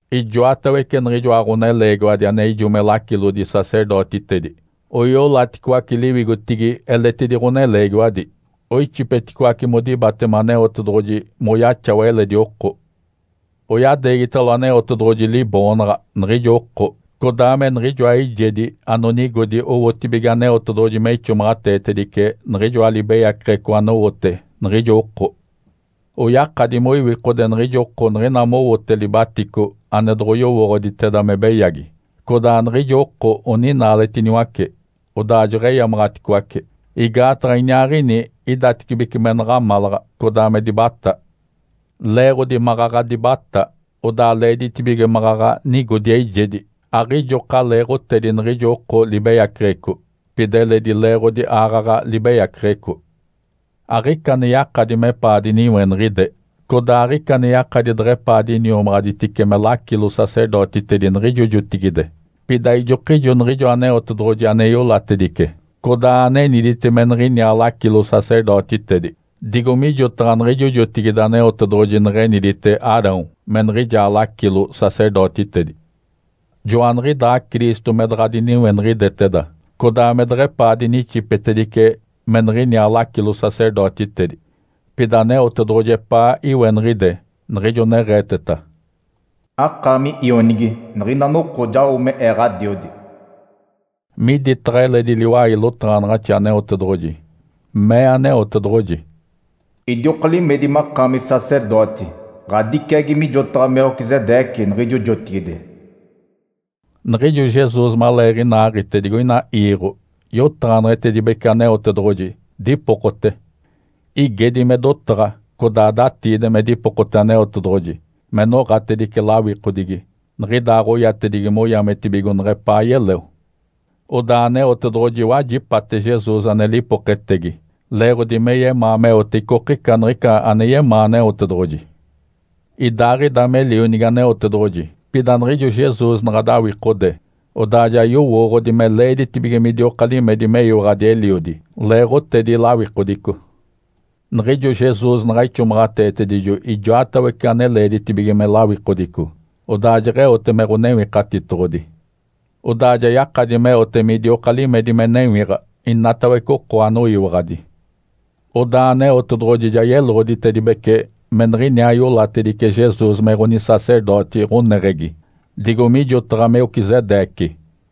Ijoatawece niɡ̶ijoa ɡ̶oneleegiwadi ane ijo me lacilodi-sacerdotitedi oiolaticoace liwigotigi eletidi ɡ̶oneleegiwadi, oixipeticoace modibatema Aneotedoɡ̶oji moyaxawa eledi oko. Oyadeegitalo Aneotedoɡ̶oji liboonaɡ̶a niɡ̶ijo oko, codaa me niɡ̶ijoa eijedi anonigodi owotibige Aneotedoɡ̶oji me ixomaɡ̶ateetedice niɡ̶ijoa libeyaceɡ̶eco anowote niɡ̶ijo oko. Oyakadi moiwikode niɡ̶ijo oko niɡ̶ina mowote libatico ane doɡ̶oyowooɡ̶oditeda me beyagi, codaa niɡ̶ijo oko anoninaaletiniwace, odaa jeɡ̶eyamaɡ̶aticoace, igaataɡ̶a iniaaɡ̶ini idatecibece me naɡ̶amalaɡ̶a, codaa me dibatá. Leeɡ̶odi maɡ̶aɡ̶a dibatá, odaa leeditibige maɡ̶aɡ̶a nigodi eijedi aɡ̶ijoka leeɡ̶otedi niɡ̶ijo oko libeyaceɡ̶eco, pida eledi leeɡ̶odi aaɡ̶aɡ̶a libeyaceɡ̶eco. Aɡ̶ica ane yakadi mepaa diniweniɡ̶ide codaa aɡ̶ica ane yakadi deɡ̶epaa diniomaɡ̶aditice me lacilo-sacerdotitedi niɡ̶ijo jotigide, pida ijokijo niɡ̶ijo Aneotedoɡ̶oji ane iolatedice, codaa anenidite me niɡ̶iniaa lacilo-sacerdotitedi, digo mijotaɡ̶a niɡ̶ijo jotigide Aneotedoɡ̶oji neɡ̶enidite Arão me niɡ̶ijaa lacilo-sacerdotitedi. Joaniɡ̶idaa Cristo me daɡ̶a diniweniɡ̶ideteda, codaa me deɡ̶epaa dinixipetedice me niɡ̶iniaa lacilo-sacerdotitedi. Pida Aneotedoɡ̶oji epaa iweniɡ̶ide, niɡ̶ijo neɡ̶eeteta, “Akaami Ionigi. Niɡ̶ina noko jao me Ee Ǥadiodi.” Miditaɡ̶a eledi liwai lotaɡ̶anaɡ̶axi Aneotedoɡ̶oji, mee Aneotedoɡ̶oji, “Idioka limedi makaami sacerdoti, ɡ̶adiciagi mijotaɡ̶a Melquisedeque, niɡ̶ijo jotigide.” Niɡ̶ijo Jesus maleeɡ̶inaaɡ̶ite digoina iiɡ̶o, yotaɡ̶aneɡ̶etedibece Aneotedoɡ̶oji, dipokote. Igedi me dotaɡ̶a codaa datiidi me dipokote Aneotedoɡ̶oji me noɡ̶atedice lawikodigi niɡ̶idaaɡ̶oyatedigi moyametibigo neɡ̶epaa yeleo. Odaa Aneotedoɡ̶oji wajipate Jesus ane lipoketegi leeɡ̶odi me yemaa meote icokica niɡ̶ica ane yemaa Aneotedoɡ̶oji. Idaaɡ̶ida me Lionigi Aneotedoɡ̶oji, pida niɡ̶ijo Jesus naɡ̶a dawikode, odaa ja yowooɡ̶odi me leeditibige midioka limedi meyiwaɡ̶adi Eliodi leeɡ̶otedi lawikodico. Niɡ̶ijo Jesus naɡ̶a ixomaɡ̶ateetedijo ijoatawece ane leeditibige me lawikodico, odaa jeɡ̶eote me Ǥonewikatitoɡ̶odi. Odaa ja yakadi meote midioka limedi me newiɡ̶a inatawece oko anoyiwaɡ̶adi. Odaa Aneotedoɡ̶oji ja yeloɡ̶oditedibece me niɡ̶iniaa iolatedice Jesus me ɡ̶onisacerdoti ɡ̶oneɡ̶egi, digo mijotaɡ̶a Melquisedeque.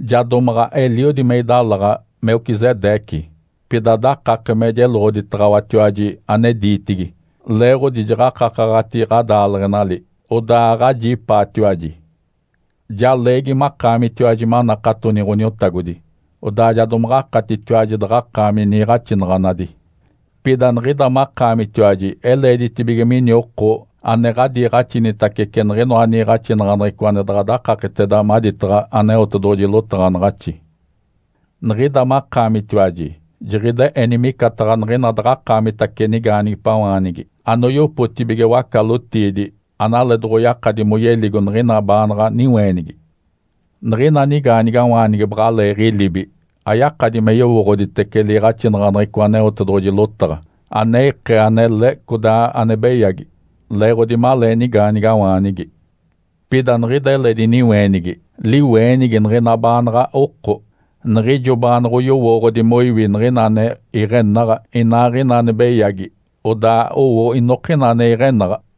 Ja domaɡ̶a eliodi me idalaɡ̶a Melquisedeque, pida dakake me jeloɡ̶oditaɡ̶awatiwaji ane diitigi, leeɡ̶odi jaɡ̶akakaɡ̶ati ɡ̶adaaleɡ̶enali, odaa aɡ̶ajipaatiwaji. Ja leegi makaamitiwaji manakatoni Ǥoniotagodi, odaa ja domaɡ̶akatitiwaji daɡ̶akaami niiɡ̶axinaɡ̶anadi. Pida niɡ̶ida makaamitiwaji eleeditibige mini oko ane ɡ̶adiiɡ̶axinitacece niɡ̶inoa niiɡ̶axinaɡ̶aneɡ̶eco ane daɡ̶a dakaketeda maditaɡ̶a Aneotedoɡ̶oji lotaɡ̶anaɡ̶axi. Niɡ̶ida makaamitiwaji jiɡ̶ide eni micataɡ̶a niɡ̶ina daɡ̶akaamitace nigaanigipawaanigi anoyopotibige waca-lotiidi, analee doɡ̶oyakadi moyeligo niɡ̶ina baanaɡ̶a niweenigi. Niɡ̶ina nigaanigawaanigi baɡ̶aleeɡ̶ilibi, ayakadi me yowooɡ̶oditece liiɡ̶axinaɡ̶aneɡ̶eco Aneotedoɡ̶oji lotaɡ̶a ane ikee anele, codaa ane beyagi, leeɡ̶odi malee nigaanigawaanigi. Pida niɡ̶ida eledi niweenigi, liweenigi niɡ̶ina baanaɡ̶a oko, niɡ̶ijo baanoɡ̶oyowooɡ̶odi moiwi niɡ̶ina ane iɡ̶enaɡ̶a, inaaɡ̶ina ane beyagi, odaa owo inokina ane iɡ̶enaɡ̶a.